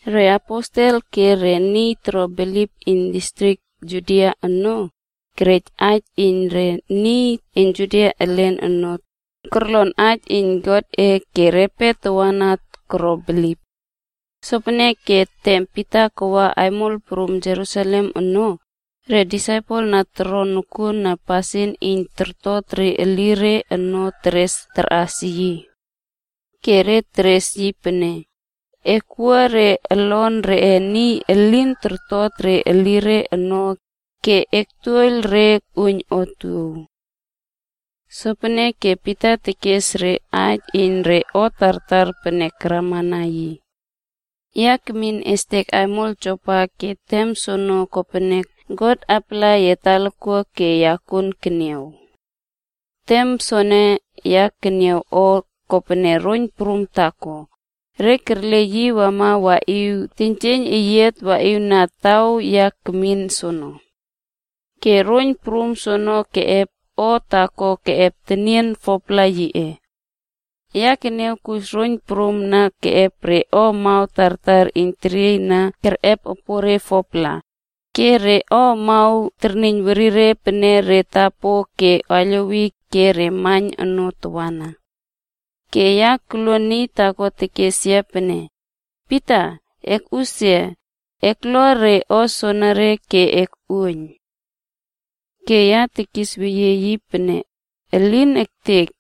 Reaposel ke re niy toro bilip iyn distrik Judia ono, kerej aij iyn re niy Juda elin ono, korlon aij iyn Godꞌe ke repe tawana koro bilip. Sopeneke tem Pita waꞌa aimol prum Jerusalem ono, re disaipel na torto nokuona pasin iyn tortot re elire ono keres karꞌas yi. Ke re teres yi pene, “E kowua re olon reꞌe niy elin kortot re elire ono ke e kotuoiyl re koꞌuoiyn otuow.” Sopeneke Pita kespaij re aij iyn re o tartar pene karamana yi. “Ya kemin estek aimol Jopa ke tem soono kopene God apala yia talakuak ke ya kuon keniaw. Tem soene ya keniaw o kopene roiyn prum taako, re kerle yi wama waꞌiw teiynjieiyn eyiat waꞌiwna taw ya akmin soono. Ke roiyn prum soono keꞌep o taako keꞌep tenien 4-pla yiꞌe. Ya keniaw kus roiyn prum na keꞌep re o amaw tartar iyn teriey na kerꞌep epoꞌore 4-pla, ke re o amaw terniyn werire pene re tapo ke aiylowi, ke re maiyn ono tawana. Ke ya koluon niy taako tekes yia pene, ‘Pita! Ekꞌusia, eklua re o soenere ke ekꞌuoiyn.’ “Ke ya tekis weyie yi pene, ‘Elin ektek!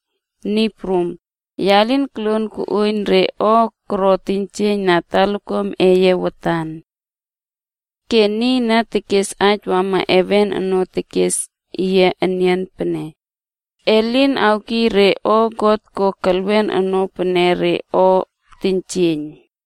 Niy Prum, ya lin koluon koꞌuoiyn re o koro teiynjieiyn na talakuam eye watan.’ “Ke niy na kes aij wama heven ono tekes yia enian pene, ‘E lin awkiy re o God ko kelwen ono pene re o teiynjieiyn.’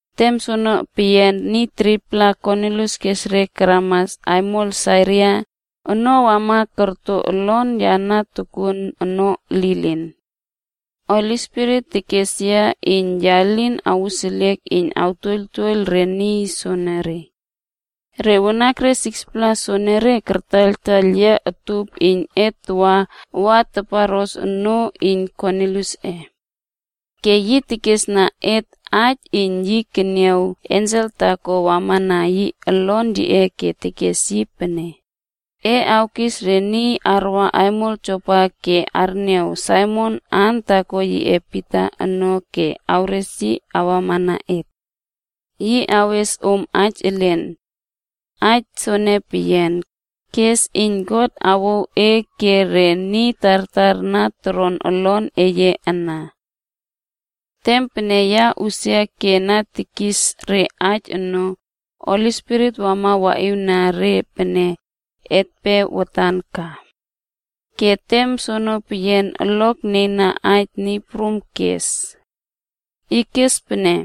“Tem soono peyian niy 3-pla Kornilius keres re karama aimol Sisaria ono wama korto olon ya na tokuon ono lilin. Holi Spirit kes yia iyn ya lin awuseliek iyn awtuoiyltuoiyl re niy soenere. Re wanakre 6-pla soenere, kartaiyltaiyl yia utup iyn et tawa wa taparꞌos onoo iyn Korniliusꞌe. Ke yi kesna et aij iyn yi keniaw ensel taako wamana yi olon yiꞌe ke kes yi pene, ‘E awkis re niy arwa aimol Jopa ke arniaw Saimon aan taako yiꞌe Pita ono ke awres yi awamana e. Yi awes om aij elen. Aij soene peyian, kes iyn God awouw e ke re niy tartar na toron olon eye ana.’ “Tem pene ya usia ke na tekis re aij ono, Holi Spirit wama waꞌiwna re pene etpe watan ka. Ke tem soene peyian, olok nieiyna aij Niy Prum kes. Yi kes pene,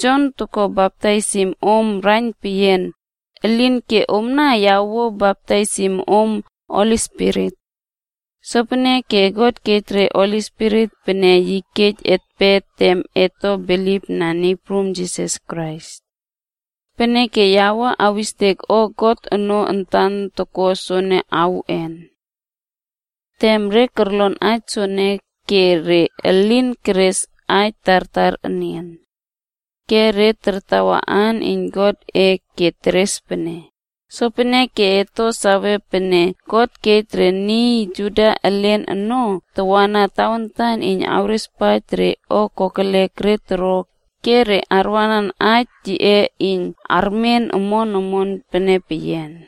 ‘Jon toko baptaisim om raiyn peyian, elinke omna ya awuo baptaisim om Holi Spirit.’ Sopeneke God kej re Holi Spirit pene yi kej etpe tem et to bilipna Niy Prum Jisas Krais. Peneke ya wua awistek o God ono antan toko soene awuꞌen?” Tem re korlon aij soene ke re elin keres aij tartar enian. Re kartawa aan iyn Godꞌe ke teres pene, “Sopeneke et to sawe pene God kej re niy Juda elin ono tawana tawantan iyn artapala ke arꞌepesie re o kokelek re toro ke re arwanan aij yiꞌe iyn armen omon omon pene peyian.”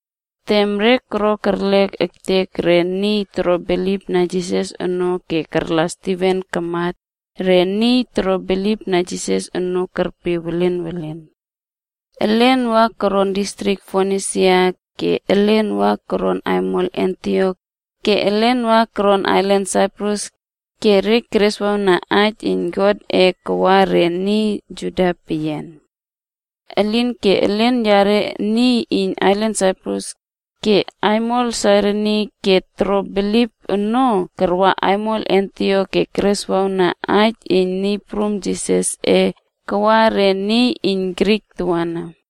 Tem re koro kerlek ektek re niy toro bilipna Jisas ono ke karla Stiven kamat, re niy toro bilipna Jisas ono kerpe welen welen. Elen wa koron distrik Fonisia, ke elen wa koron aimol Antiok ke elen wa koron ailan Saiprus ke re kereswawna aij iyn Godꞌe kawa re niy Juda peyian. Elinke elen yare niy iyn ailan Saiprus ke aimol Sairini na toro bilip ono karwa aimol Antiok ke kereswawna Aij iyn Niy Prum Jisasꞌe kawa re niy iyn Grik tawana.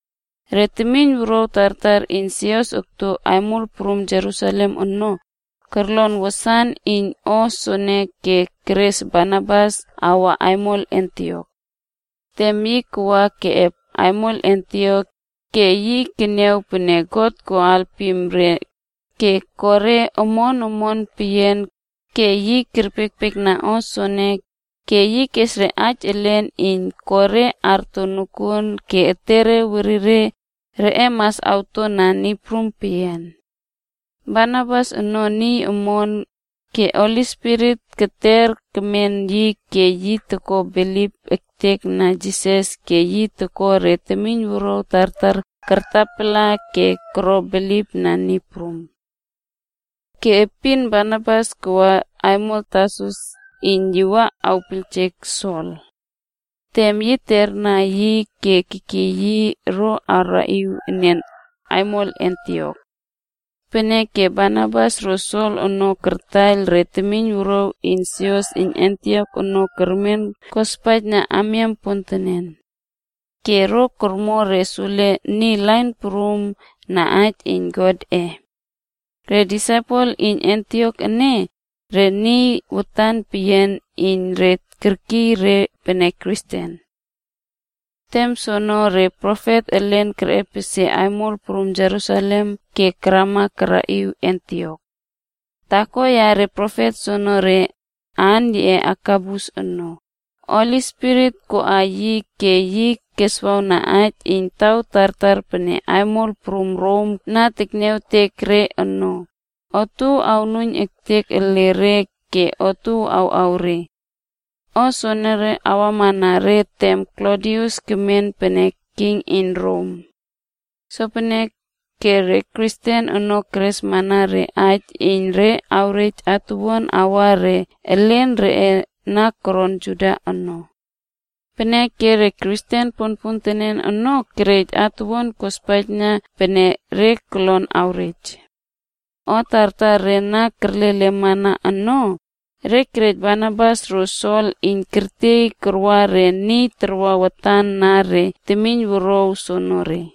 Re temiyn wuruaw tartar iyn sios okto aimol prum Jerusalem ono, korlon wasan iyn o soono ke keres Barnabas kawa aimol Antiok. Tem yi waꞌa keꞌep aimol Antiok, ke yi keniaw pene God ko alpim re ke ko re omon omon peyian ke yi kerpiekpiekna o soene ke yi kes re aij elen iyn ko re arto nokuon ke etere werire reꞌe mas awto na Niy Prum peyian. Barnabas ono niy omon, ke Holi Spirit tekter tekmen yi ke yi toko bilip ektekna Jisas ke yi ko re temiyn wuruaw tartar kartapala ke koro bilipna Niy prum. Ke epin Barnabas kawa aimol Tarsus iyn yi wa awpiyljek Sol. Tem yi terna yi ke kekiy yi ro karaꞌiw enian aimol Antiok. Peneke Barnabas ro Sol ono kartaiyl re temiyn wuruaw iyn sios iyn Antiok ono kermen kospaijna amiam pontenen. Ke ro kormo re sule niy lain prum na aij iyn Godꞌe. Re disaipel iyn Antiok ene, re niy watan peyian iyn re kerkiy re pene Kristen. Tem soono re profet elen kerꞌepesie aimol prum Jerusalem ke karama karaꞌiw Antiok. Taako yare profet soonore, aan yiꞌe Agabus ono, Holi Spirit koꞌa yi ke yi keswawna aij iyn taw tartar pene aimol prum Rom na tekniawtek re ono, otuow awnuiyn ektek ele re ke otuow awꞌaw re. O soene wamana re tem Klodius kemen pene king iyn Rom. Sopeneke re Kristen ono keresmana re aij iyn re awrej atuwuan awa re elen reꞌe na koron Judia ono. Peneke re Kristen ponpontenen ono, kerej atuwuan kospaijna pene re kolon awrej. O tartar re na kerlelemana ono, re kerej Barnabas ro Sol ono iyn tertiey tarwa re niy iyn tarwa watan na re temiyn wuruaw soonore.